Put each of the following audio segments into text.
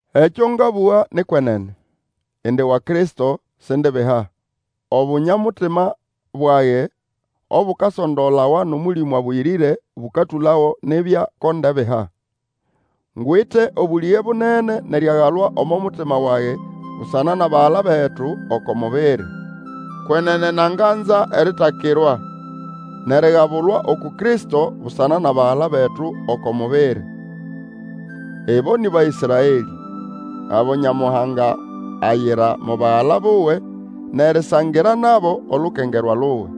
Ekyo ngabũga ni kwenene; indi wa Kristo, sindibiha. Obunya-mutima bwage, obukasondolawa nʼOmũlĩmũ Abũyĩrĩre bũkatũlago nibya ko ndebiha. Ngwite obũlĩge bunene nʼeriagalwa omo mutima wage busana nʼabagala betu oko mubiri. Kwenene nanganza eritakirwa, nʼerigabulwa uku Kristo busana nʼabagala betu oko mubiri! Ibo nĩ Baĩsraelĩ, abo Nyamuhanga ayira mo bagala buwe nʼerisangira nabo olukengerwa luwe.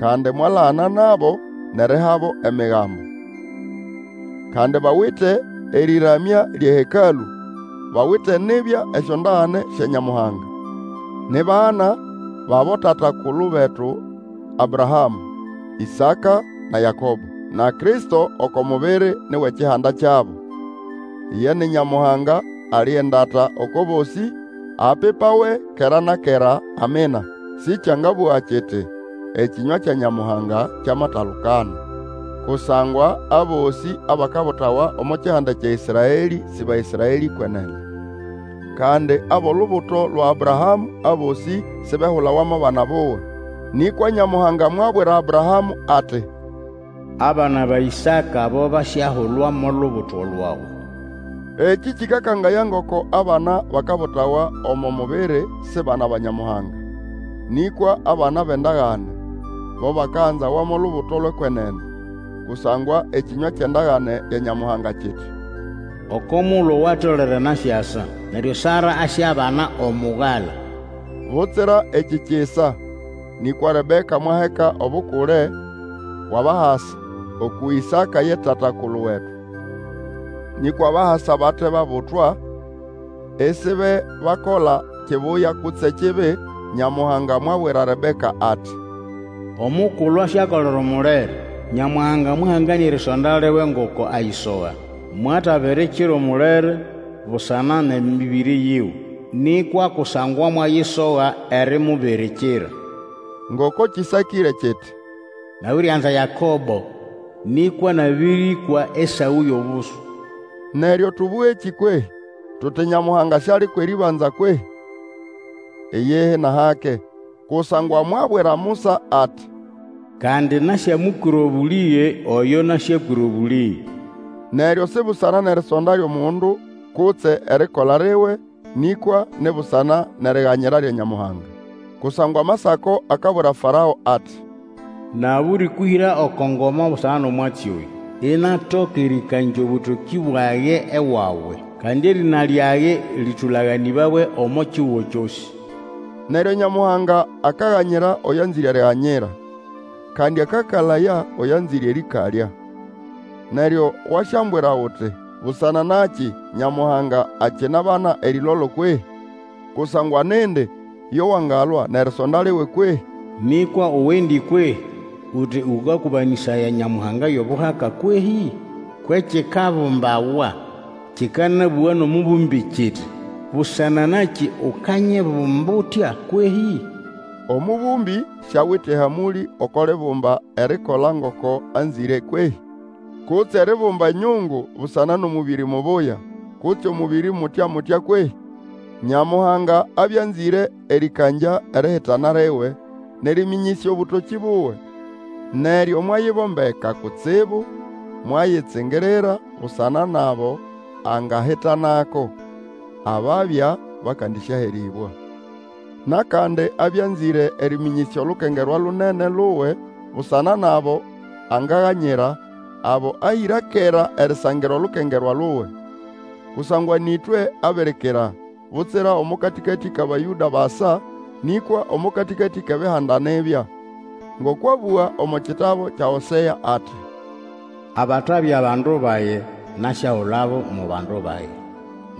Kandi mwalagana nabo, nʼerihabo Emigambo. Kandi bawite erĩramya lyʼeHekalũ, bawite nibya esyondagane sya Nyamuhanga. Ni bana bʼabotata-kulu betu Abrahamũ, Ĩsaka, na Yakobo. Na Kristo oko mubiri ni wʼekihanda kyabo. Iye ni Nyamuhanga ali endata oko bosĩ, apipawe kera na kera. Amina. Sĩkyangabũgwa kiti, ekĩnywa kya Nyamuhanga kyamatalukana. Kusangwa abosĩ abakabutawa omo kihanda kya Ĩsraelĩ sĩ Baĩsraelĩ kwenene. Kandi abʼolubuto lwa Abrahamũ abosĩ sibehulawa mo bana buwe. Nĩkwa Nyamuhanga mwabwira Abrahamũ ati, Abana ba Ĩsaka bo basyahulwa mo lubuto lwawe. Ekĩ kĩkakangaya ngoko abana bakabulawa omo mubiri si bana ba Nyamuhanga, nĩkwa abana bʼendagane, bo bakaganzawa mo lubuto lwʼekwenene. Kusangwa ekĩnywa kyʼendagane ya Nyamuhanga kiti, oko mugulu owatolere nasyasa, neryo Sara asyabana omugala. Butsira ekĩ kisa, nĩkwa Rebeka mwaheka obukule bwʼabahasa, uku Ĩsaka ye tata-kulu wetu. Nĩkwa abahasa bate babutwa, isibebakola kibuya kutse kibi, Nyamuhanga mwabwira Rebeka ati, Omukulu asyakolera Omulere; Nyamuhanga mwahanganĩa erisonda liwe ngoko ayisoga, mwatabirikira Omulere busana nʼemĩbĩrĩ yiwe, nĩkwa kusangwa mwayi soga erimubirikira. Ngoko kĩsakĩre kiti: Nabirianza Yakobo, nĩkwa nabĩrĩkwa Esaũ yʼobusu. Neryo tũbũgekĩ kwehĩ? Tuti Nyamuhanga siali kwʼerĩbanza kwehĩ? Iyihi nʼahake! Kusangwa mwabwira Musa ati, Kandi, nasyamũkwĩra obũlĩge oyo nasyakwĩra obũlĩge. Neryo si busana nʼerisonda lyʼomundu kutse erikola liwe, nĩkwa ni busana nʼeriganyira lya Nyamuhanga. Kusangwa Amasako akabwira Farao ati, Nabĩrĩkũhĩra oko ngoma busana nʼomwatsi oyũ, inatoka erĩkangya obũtokĩ bwage ewawe, kandi erĩna lyage lĩtũlaganĩbawe omo kihugo kyosĩ. Neryo Nyamuhanga akaganyira oyo anzĩre eriganyira, Kandi akakalaya oyo anzĩre erĩkalya. Neryo wasyambwira uti, Busana nakĩ Nyamuhanga akinabana erĩlolo kwehi? Kusangwa nindi yo wangalwa nʼerisonda liwe kwehĩ? Nĩkwa uwendi kwehĩ, uti ũkakũbĩsanaya Nyamuhanga yʼobuhaka kwehĩ? Kwʼekikabumbawa kĩkanabũga nʼomũbũmbĩ kiti, Busana nakĩ ukanyibumba utya kwehĩ? Omũbũmbĩ siawite ehamũlĩ oko libumba erikola ngoko anzĩre kwehĩ? Kutse eribumba enyungu busana nʼomũbĩrĩ mubuya, kutse omũbĩrĩ mutya-mutya kwehĩ? Nyamuhanga abya anzĩre erĩkangya erihitana liwe, nʼerĩmĩnyĩsya obũtokĩ buwe. Neryo mwayibombeka kutsibu mwayitsingirira busana nʼabo angahitanako, ababya bakandĩsyaherĩbwa. Nʼakandi abya anzĩre erĩmĩnyĩsya olukengerwa lunene luwe busana nʼabo angaganyira, abo ahĩra kera erisangira olukengerwa luwe. Kusangwa nĩ ĩtwe abirikira, butsira omo katĩkatĩ kʼAbayũda basa, nĩkwa omo katĩkatĩ kʼEbihanda nibya. Ngoko abũga omo kitabu kya Hosea ati, Abatabya bandu bage, nasyahulabo mo bandu bage.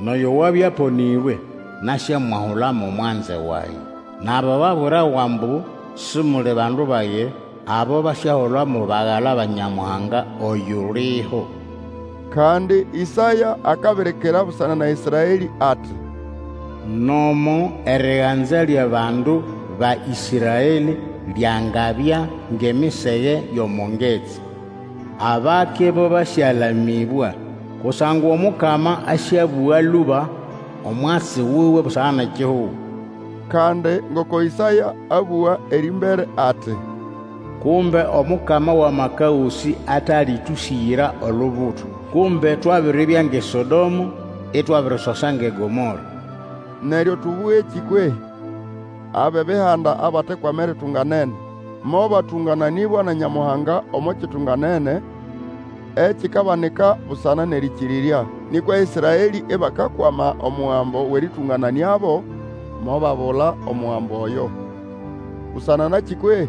Nʼoyo wabya aponĩrwe, nasyamwahula mo mwanze wage. Nʼabo babwirawa ambu, Simuli bandu bage, Abo basyahulwa mo bagala ba Nyamuhanga oyuliho. Kandi Ĩsaya akabirikira busana na Ĩsraelĩ ati, Nomo eriganza lyʼabandu ba Ĩsmaelĩ lyangabya ngʼemisege yʼomo ngetsi, abake bo basyalamĩbwa. Kusangwa Omukama asyabũga lũba omwatsi wuwe busana nʼekihugo. Kandi ngoko Ĩsaya abũga erĩmbere ati, Kumbe Omukama wʼAmaka Gosĩ atatũsĩgĩra olubuto, Kumbe twabiribya ngʼeSodomo, itwabirisosa ngʼeGomora. Neryo tũbũgekĩ kwehĩ? Abʼebihanda abatekwama eritunganene, mobatũngananĩbwa na Nyamuhanga omo kitunganene ekikabanika busana nʼerĩkĩrĩrya. Nĩkwa Ĩsraelĩ ibakakwama omugambo wʼerĩtũngananĩabo, mobabula omugambo oyo. Busana nakĩ kwehĩ?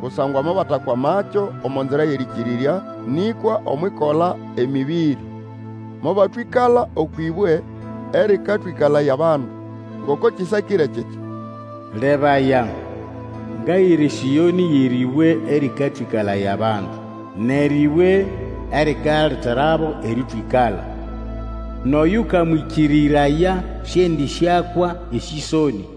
Kusangwa mobatakwamakyo omo nzira yʼerĩkĩrĩrya, nĩkwa omwʼikola emĩbĩrĩ. Mobatwĩkala okwʼĩbwe erĩkatwĩkalaya abandu. Ngoko kĩsakĩre kiti, Lebaya, ngahĩra eSĩonĩ yʼerĩbwe erĩkatwĩkalaya abandu, Nʼerĩbwe erikaleterabo erĩtwĩkala. Nʼoyũkamwĩkĩrĩraya sĩendĩsyakwa esĩsonĩ.